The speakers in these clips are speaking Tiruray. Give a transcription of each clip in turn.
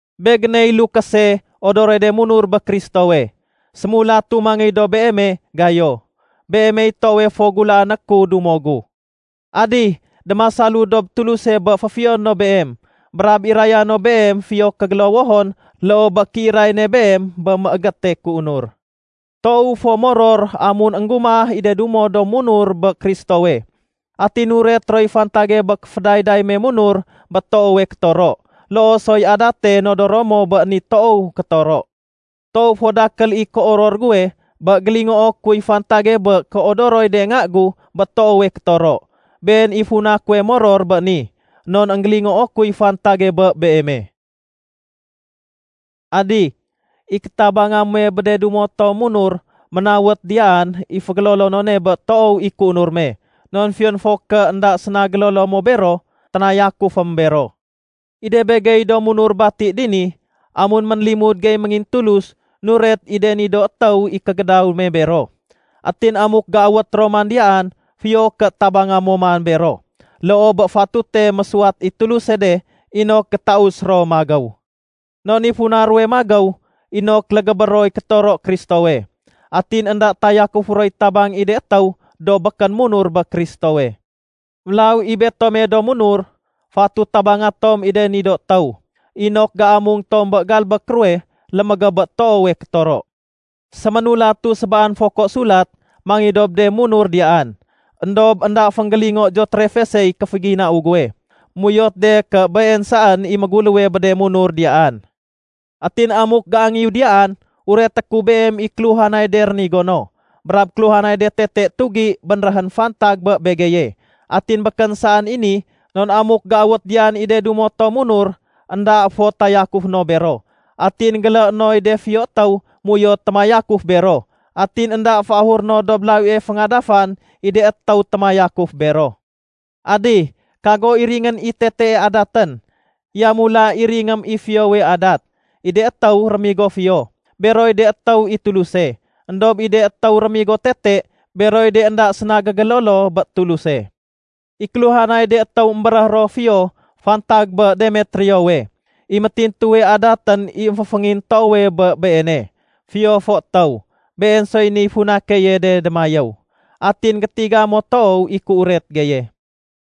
Begéney lukése odoroy de munur bé Kristowe. Sémulatu mangéy dob beeme, Gayo. Beemey toowe fo gulaané ku dumo gu. Adih, démasalu dob Tuluse bé féfiyoné no beem brab iraya no beem fiyo kégélowohon loo bé kéiray ne beem bé mégéte kéunur. Toowu fo moror amun énggumah i de dumo to munur bé Kristowe atin nuret roy fantage bé kéfédayday me munur bé toowe kétoro, loo soy adate nodoro mo bé ni toow kétoro. Toow fo dakél i kéoror guwe bé gélingoo kuy fantage bé kéodoroy de nga gu bé toowe kétoro. Been i funa kuwe moror béni, non énggélingoo kuy fantage bé beeme. Adih, i kétabanga muwe bé de dumo tom munur ménawet diyaan i fégélolonone bé toow i kéunur me. Non fiyon fo ké énda séna gélolo mo bero, ténayakufém bero. I de begey do munur bati dini, amun ménlimud gey méngintulus, nuret i de ni do étéw i kégédaw me bero. Atin amuk géawét ro man diyaan, fiyo ké tabanga mo man bero loo bé fatute mésuwat i Tuluse de inok gétaus ro magéw. Non i funa ruwe magéw inok légébé roy kétoro Kristowe. Atin énda tayakufé roy tabang i de étéw do békén munur bé Kristowe. Mélaw i betome do munur, fatut tabanga tom i de ni do étéw inok géamung tom bé galbék ruwe lémégéb bé toowe kétoro. Séménulatu sébaan foko sulat mangéy dob de munur diyaan, éndob énda fénggélingo Deotrefesey kéféginau guwe. Méuyot de ké been saén i méguléwe bé de munur diyaan. Atin amuk géangéyu diyaan, ureté ku beem i kéluhanay de rénigo no, brab kéluhanay de tete tugi bénréhén fantag bé begeye. Atin békén saén i ni, non amuk géawét diyaan i de dumo tom munur, énda fo tayakufé no bero. Atin géléé noy de fiyo étéw méuyot témayakuf bero, atin énda féahuré no dob lawie féngadafan i de étéw témayakuf bero. Adih, kago iringén i tetee adatén. Yamula iringém i fiyowe adat. I de étéw rémigo fiyo, beroy de étéw i Tuluse. Endob i de étéw rémigo tete, beroy de énda séna gégélolo bé Tuluse. I kéluhanay de étéw émbéréh ro fiyo fantag bé Demetriowe. I métintuwe adatén i émféféngintoowe bé i beene, fiyo fo étéw. Been soy niy funa keye de démayéw. Atin gétiga mo toow i kéuret geye.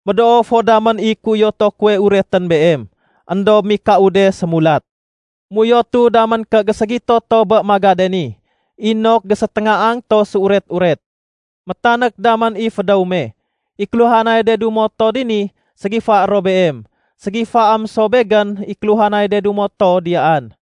Médoo fo damén i kéuyoto kuwe uretén beem, éndob mikau de sémulat. Méuyotu damén ké géségito to bé magade ni inok géséténgaang to séuret-uret. Métanék damén i fédéw me. I kéluhanay de dumo to dini ségifaé ro beem. Ségifaém so begén i kéluhanay de dumo to diyaan.